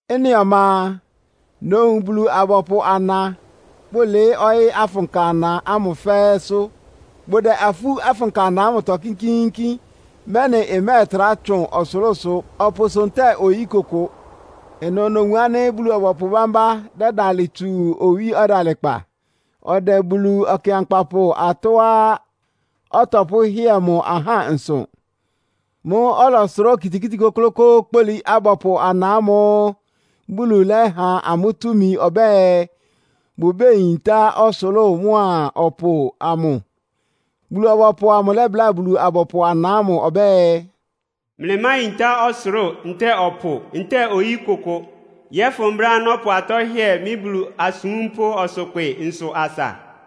Ɩ́nɩ ɔma a, nowun Bulu-abɔpʋ ana, bʋlɩɩ́ ɔyɩ́ afʋnka ana ámʋ fɛ́ɛ́sʋ́. Bʋdɛ afú afʋnka ana ámʋtɔ kínkíínkín, mɛ́nɩ ɩmɛ́ɛtrá tsʋn ɔsʋlʋ́sʋ, ɔpʋsʋ ntɛ́ɛ oyí kʋkʋ. Ɩnʋ nowun ánɩ́ Bulu-ɔbɔpʋ bámbá dɛ́dalɩ tsu owí ɔdalɩkpa. Ɔdɛ Bulu Ɔkɩankpapʋ atɔ́á ɔtɔpʋ́hɩ́ɛ mʋ ahá nsʋ. Mʋ́ʋ́ ɔlɔsʋrá okitikíti kʋ́klʋ́kʋ́ʋ́ kpólí abɔpʋ ana ámʋ́ʋ́ Bulu lɛ́ha amʋ́ túmi ɔbɛ́ɛ, bʋbéyintá ɔsʋlʋ́ʋ mʋ́a ɔpʋ amʋ. Bulu-ɔbɔpʋ amʋ lɛ́bláa Bulu-abɔpʋ ana ámʋ ɔbɛ́ɛ, “Mlɩmáyintá ɔsʋlʋ́ʋ ntɛ́ɛ ɔpʋ ntɛ́ɛ oyí kʋkʋ, yɔ́fʋn brɛ́á nɔ́pʋ atɔ́ hɩ́ɛ mɩ́ Bulu asúmpʋ́ ɔsʋkpɩ nsʋ asa.”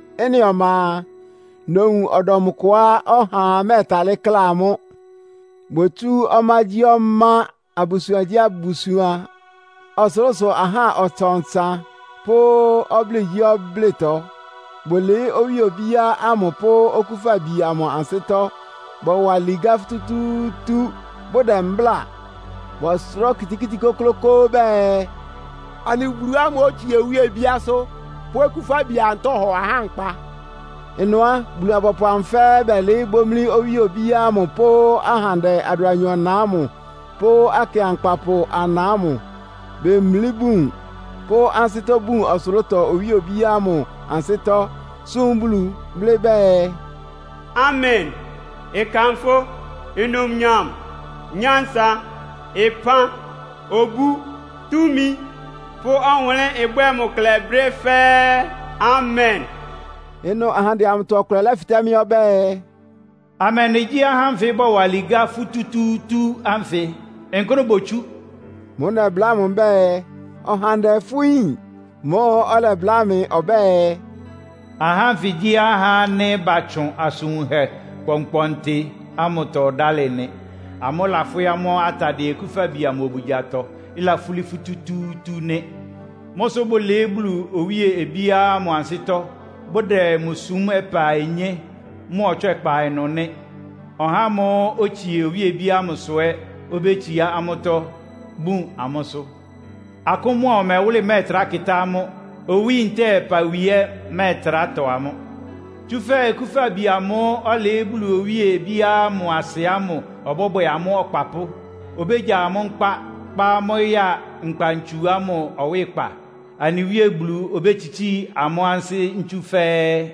Ɩ́nɩ ɔma a, nowun ɔdɔm kʋá ɔhaa mɛ́ɛtalɩ́ kla amʋ́. Botsú ɔmágyíɔmá, abusuangyíabusuan, ɔsʋlʋ́sʋ ahá ɔtsan-ɔtsan pʋ́ ɔblɩ́ɩgyíɔblɩ́ɩtɔ. Bʋlɩɩ́ owíe obíá ámʋ pʋ́ Okúfabi amʋ ansɩ́tɔ́. Bɔwa ligá futútúútú, bʋdɛ mbláa. Bɔsʋrá okitikíti kʋ́klʋ́kʋ́ʋ́ bɛɛ, “Anɩ Bulu ámʋ́ʋ́ otsie owíe obíásʋ́ pʋ́ Okúfabi amʋ tɔ́hɔ ahá nkpa!” Ɩnʋ á, Bulu-abɔpʋ amʋ fɛ́ɛ́ bɛlɩɩ́ bómlí owíe obíá ámʋ pʋ́ ahandɛ adʋanyɔ-na ámʋ pʋ́ akɩankpapʋ ana ámʋ. Bemlí bun, pʋ́ ansɩ́tɔ́ bun ɔsʋlʋ́tɔ owíe obíá ámʋ ansɩ́tɔ́, súm Bulu, blɩ́ bɛɛ, “Amen! Ɩkanfʋ́, numnyam, nyánsa, ɩpán, obú, túmi pʋ́ ɔwʋnlɩ́n ɩbwɛ́ɛ mʋ klɛ brɛ́ fɛ́ɛ́! Amen!” Ɩnʋ ahandɛ amʋtɔ ɔkʋlɛ lɛ́fɩtɛ́ mɩ́ ɔbɛ́ɛ, “Amɛndɩ gyí ahá ánfɩ bɔwa ligá fútútúútú ánfɩ? Nkʋ́nʋ́ botsú?” Mʋ́ʋ́ nɛbláa mʋ mbɛ́ɛ, “Ɔhandɛ, fʋ́ yín.” Mʋ́ʋ́ ɔlɛbláa mɩ ɔbɛ́ɛ, “Ahá ánfɩ gyí ahá ánɩ́ batsʋn asʋn wunhɛ kpɔnkpɔntɩ ámʋtɔ dálɩ nɩ. Amʋ́ láfwɩ́ amʋ́ atadɩɛ Okúfabi amʋ obugyatɔ, ɩlafúlí futútúútú nɩ́. Mʋ́ sʋ́ bʋlɩɩ́ Bulu owíe obíá ámʋ ansɩ́tɔ́, bʋdɛ mʋ súm ɔpa-onyé mʋ ɔtswɛ́kpa ɩnʋ nɩ́. Ɔhá ámʋ́ʋ́ otsie owíe obíá ámʋsʋ ɛ́ obétsiá amʋ́tɔ́, bún amʋ́sʋ́. Akʋ́n mʋ́a ɔmɛwʋ́lɩ mɛ́ɛtrá kɩ́tá amʋ́, owí ntɛ́ɛ ɔpawi ɛ́ ɩmɛ́ɛtrá tɔ amʋ́. Tsúfɛ́ Okúfabi amʋ́ʋ́ ɔlɩɩ́ Bulu owíe obíá ámʋ asɩ ámʋ ɔbɔ́bwɛ amʋ́ ɔkpapʋ́. Obégya amʋ́ nkpá, kpá amʋ́ ya nkpa-ntsu ámʋ ɔwɩ́kpa, anɩ Wíe Bulu obétsitsíi amʋ́ ansɩ́ ntsú fɛ́ɛ́.”